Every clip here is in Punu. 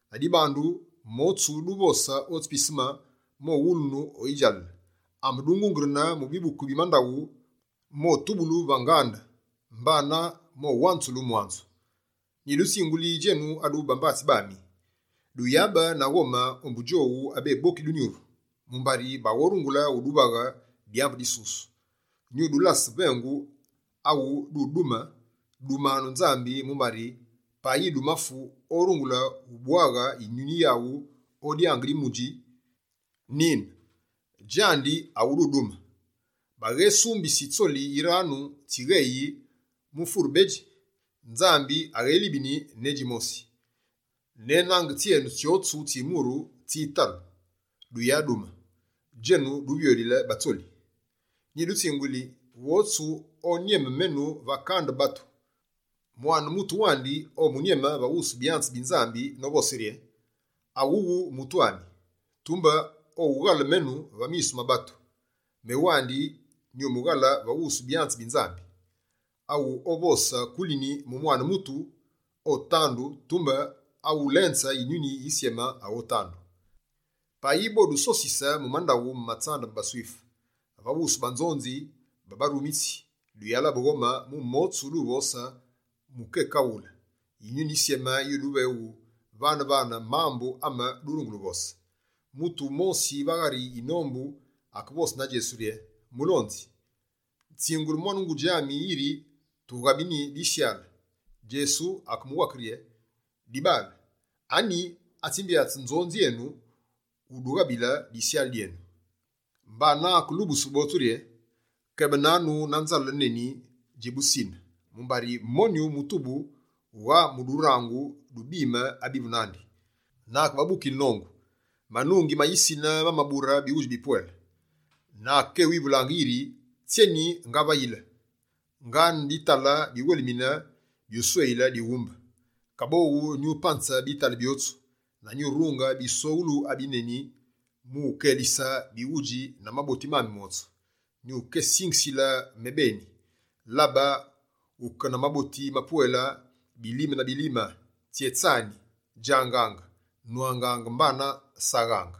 Ladibandu: Motsu duvosaange otsi piseme, mowulunu o yidjalale; ame dungungerenaange mu bibuku bi mandaghu, motubulu va ngande, mbanane mowanzulu mwanzu.» Anyi abwedji udumu? «Nyidutsinguli djenu aduvu bambatsi bami, duyabe na ghome ombu djowu abeboki dunyuru, mumbari baghorungule uduvaghe dyambu disusu. Nyudulase vengu awu dudume: dumanu Nzambi mumbari payi dumafu, orungule ubwaghe yinyuni wandi o dyange di mudji. Nine, djandi awu dudume. Baghesumbisi tsoli yiranu tsigheyi mu fure bedji? Nzambi aghélibini ne djimosi. Ne nange tsyenu tsyotsu tsi myuru tsitalu. Duyadume, djenu duvyoghulile batsoli.» «Nyidutsinguli, wotsu onyeme menu va kande batu, Mwane Mutu wandi omunyeme va wusu byanze bi Nzambi novose rye: awuwu mutu ami. Tumbe owughale menu va misu ma batu, mewandi nyumughale va wusu byanze bi Nzambi. Awu ovose kulini mu Mwane Mutu, otandu, tumbe awu ulenze Yinyuni Yisyeme, aghotandu. Payi bodusosise mu mandaghu ma tsambu ma baSwife va wusu banzonzi na barumitsi, duyalabe ghome mu motsu duvose mu kekaghule. Yinyuni Yisyeme yuduveghe vane-vane mambu ame durungule uvose.» Mutu wumosi va ghari yinombu akevose na Djesu rye: «Mulonzi, tsingule mwane ngudji ami yiri tughabini disyale.» Djesu akemuwake rye: «Dibaale, anyi atsimbyatse nzonzi enu umudughabile disyale dyenu?» Mbana, akelubuse botsu rye: «Kebananu na nzale neni dji busine, mumbari monyu mutu wughaa mu durangu du bime abivu nandi.» Na akebabukile nongu: «Manungi ma yisine ma mabure bighudji bipwele. Na akekéwivulaange yiri: “Tsyeni ngavayile? Ngaane bitale biwelimine byusweyile dighumbe. Kaboghu, nyupanze bitale byotsu, na nyurunge bisweghulu abineni, mu ukelise bighudji na maboti mami motsu. Nyukésingisile mebeni: Labe, wuke na maboti mapwele bilime na bilime, tsyétsani, djangaange, nwangaange mbana saghaange.”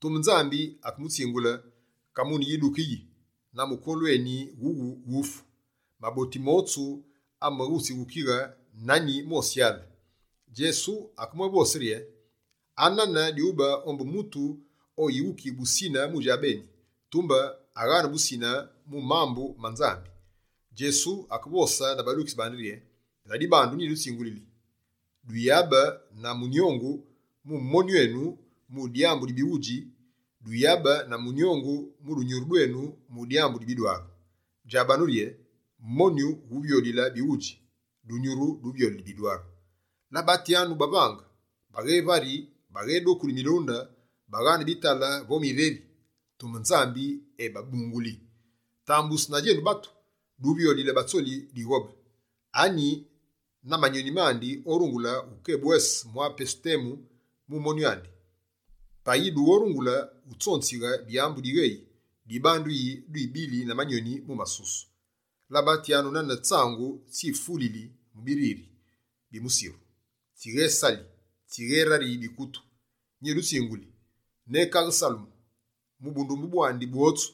Tumbe Nzambi akemutsingule: “Kamune yiduke yi, na mukolu eni wuwu wufu. Maboti motsu ameghutsighukighe na nyi mosyale?”» Djesu akebwévose rye: «Anane dyube ombu mutu oyighukiyi busine mu djabeni, tumbe aghaane busine mu mambu ma Nzambi.» Djesu akevose na badukitsi bandi rye: «Ladibandu, nyidutsinguli: duyabe na munyongu mu monyu enu mu dyambu di bighudji. Duyabe na munyongu mu dunyuru dwenu mu dyambu di bidwaru. Djabanu rye: monyu wuvyoghulile bighudji; dunyuru duvyoghulile bidwaru. Labatyanu bavange! Baghevari, baghedokuli milunde, baghaane bitale vo mireri, tumbe Nzambi ebabunguli. Tambusu na djenu batu, duvyoghulile batsoli dighobe. Anyi na manyoni mandi, orungule wukebwese mwa pesu temu mu monyu andi? Payi dughorungule wutsonzighe dyambu digheyi, dibandu yi dubile na manyoni mu masusu? Labatyanu nane tsangu tsifulili mu biriri bi musiru, tsighesali, tsigherariyi bikutu. Nyidutsinguli: ne kaghe Salemu, mu bundumbe bwandi bwotsu,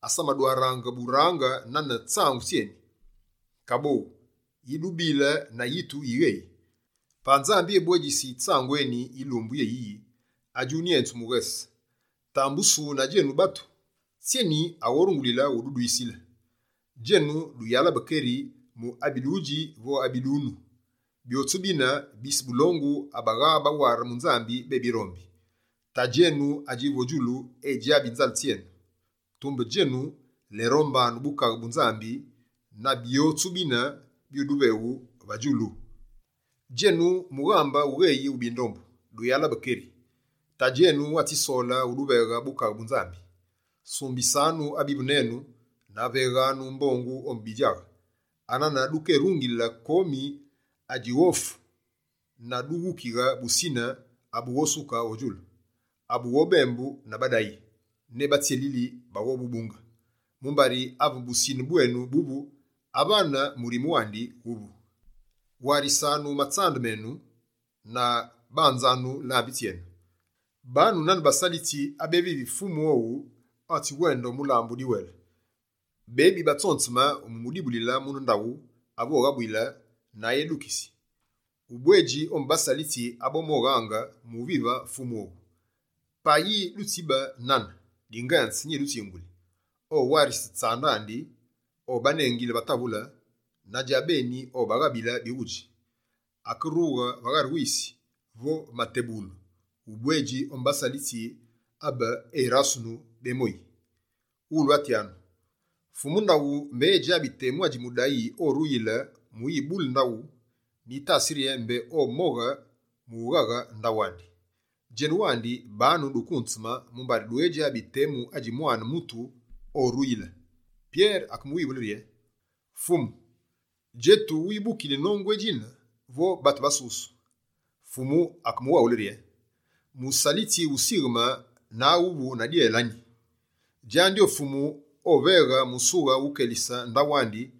asamadwaraange burange nane tsangu tsyeni. Kaboghu, yi dubile na yitu yi gheyi? Payi Nzambi ebwedjisi tsangu eni yilumbu yéyiyi adjunyenzu mughese, tambusu na djenu batu, tsyeni aghorungulile wududwisile? Djenu, duyalabe keri mu abi dudji vo abi dunu. Byotsu bine, bise bulongu abaghabaware mu Nzambi bebirombi. Tadji enu adjivu o djulu edjabi nzale tsyenu. Tumbe djenu, lerombanu Bukaghe bu Nzambi na byotsu bine, byuduveghu va djudjulu.» «Djenu mughambe wugheyi wu bindombu, duyalabe keri, Tadji enu atsisole uduveghe Bukaghe bu Nzambi. Sumbisanu abivu nenu na veghanu mbongu ombu bidjaghe. Anane dukerungile komi adjighofu na dughukighe busine abughosuke o djulu, abughobembu na badayi, ne batsyelili baghobubunge. Mumbari ave busine bwenu buvu, avane murime wandi wuvu.» «Warisanu matsande menu na banzanu lambi tsyenu. Banu nane basalitsi abevivi fumu owu atsiwende o mulambu udiwele, bebi batsonzeme mu umudibulile mune ndaghu ave oghabuyile na edukisi. Ubwedji ombu basalitsi abomoghaange mu uvive fumu owu. Payi ditsibe nane, dingenze, nyidutsinguli: owarise tsande andi, obanengile va tavule, na djabeni obaghabile bighudji. Akerughe va ghari wisi vo va matebughulu, ubwedji ombu basalitsi abe erasunu bemoyi.» «Ghulwatyanu, fumu ndaghu mbé edjabi temu adji mudayi oruyili mu uyibule ndaghu, nyitasi rye mbé omoghe mu ughaghe ndaghu andi. Djenu wandi banu dukunzeme mumbari dughejabi temu adji Mwane Mutu oruyile.» Pyere akewivule rye: «Fumu, djetu wibukili nongu edjine vo batu botsu?» Fumu akemuwaghule rye: «Musalitsi wusigheme na awuvu na dyele anyi? Djandi o fumu oveghe musughe wukelise ndaghu andi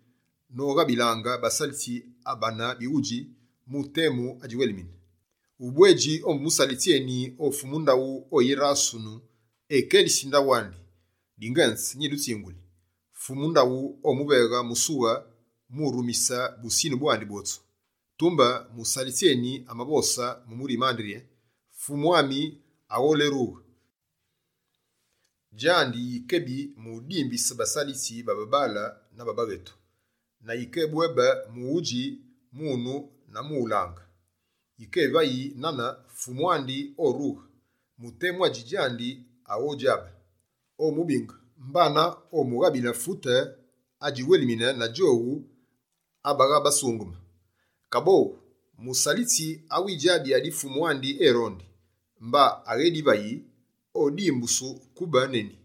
noghabilaange basalitsi abane bighudji mu temu adjiwelimine. Ubwedji ombu musalitsi eni o fumu ndaghu oyirasunu ekelisi ndaghu andi. Dingenze nyidutsinguli: fumu ndaghu omuveghe musughe mu urumise busine bwandi bwotsu. Tumbe, musalitsi eni amavose mu murime andi rye: “Fumu ami agholerughe.” Djandi yikebi mu udimbise basalitsi ba babaale na ba baghetu, na yikebwébe mu udji, mu unu na mu ulange. Yikevayi nane, fumu andi orughe mu temu adji djandi aghodjabe. Omubinge mbana omughabile fute adjiwelimine na djowu abaghabasungeme. Kaboghu, musalitsi awidjabi adi fumu andi erondi, mba aghedivayi, odimbusu kube neni.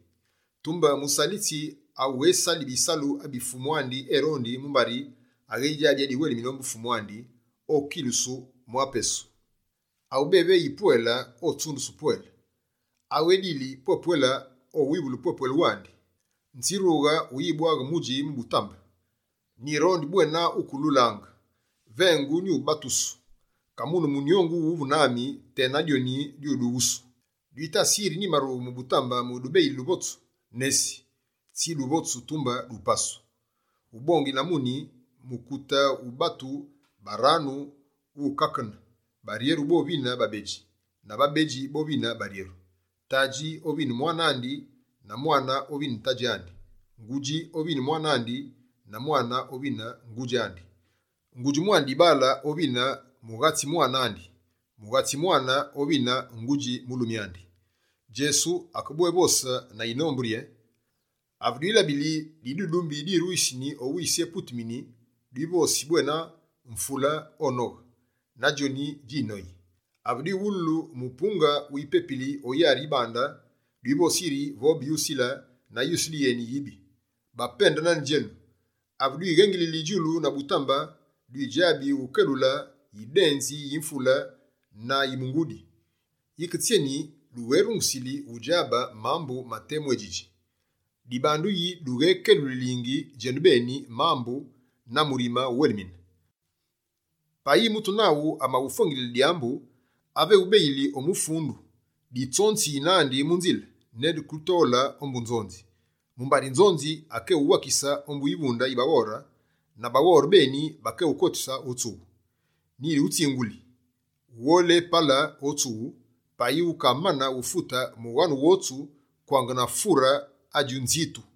Tumbe musalitsi awughesali bisalu abi fumu andi erondi, mumbari aghejabi adiwelimine ombu fumu andi, okilusu mwa pesu. Awu béveyi pwele, otsundusu pwele. Awu edili pwe-pwele, owivulu pwe-pwele wandi.» «Nzirughe o uyibwaghe mudji mu butambe, nyirondi bwena wukelulaange. Vengu nyubatusu, kamune munyongu wuvu nami tena dyoni dyudughusu! Dwitasi yiri nyimarughe mu butambe mu udubeyile duvotsu? Nesi, tsi duvotsu, tumbe dupasu. Ubongile na muni, mukute wu batu baranu wukakene, baryeru bovine babedji, na babedji bovine baryeru. Tadji ovine mwane andi na mwane ovine tadji andi; ngudji ovine mwane andi na mwane ovine ngudji andi. Ngudji mwane dibaale ovine mughatsi mwane andi; mughatsi mwane ovine ngudji mulumi andi.» Djesu akebwévose na yinombu rye: «Ave dwilabili didudumbi diruyisini o wisi eputumini, dwivosi bwena, “mvule onoghe”, na djoni djinoyi. Ave dwiwululu mupunge wipepili o yari yi bande, dwivosi yiri “vobe yusile” na yusile yeni yibi. Bapende nane djenu, ave dwighengili djulu na butambe, dwidjabi wukelule yidenzi yi mvule na yi mungudi. Yike tsyeni dugherungusili wudjabile mambu ma temu édjidji?» «Dibandu yi dughekelulingi djenubeni mambu na murime wuwelimine? Payi mutu naghu amaghufwengilile dyambu, ave eghubeyili o mufundu, ditsonziyi nandi mu nzile, ne duketole ombu nzonzi. Mumbari nzonzi akeghuwakise ombu yivunde yi baghore, na baghore beni bakeghukotise o tsughu. Nyighutsinguli: wugholepale o tsughu, payi wukamane ufute mughanu wotsu kwange na fure adji nzintu.»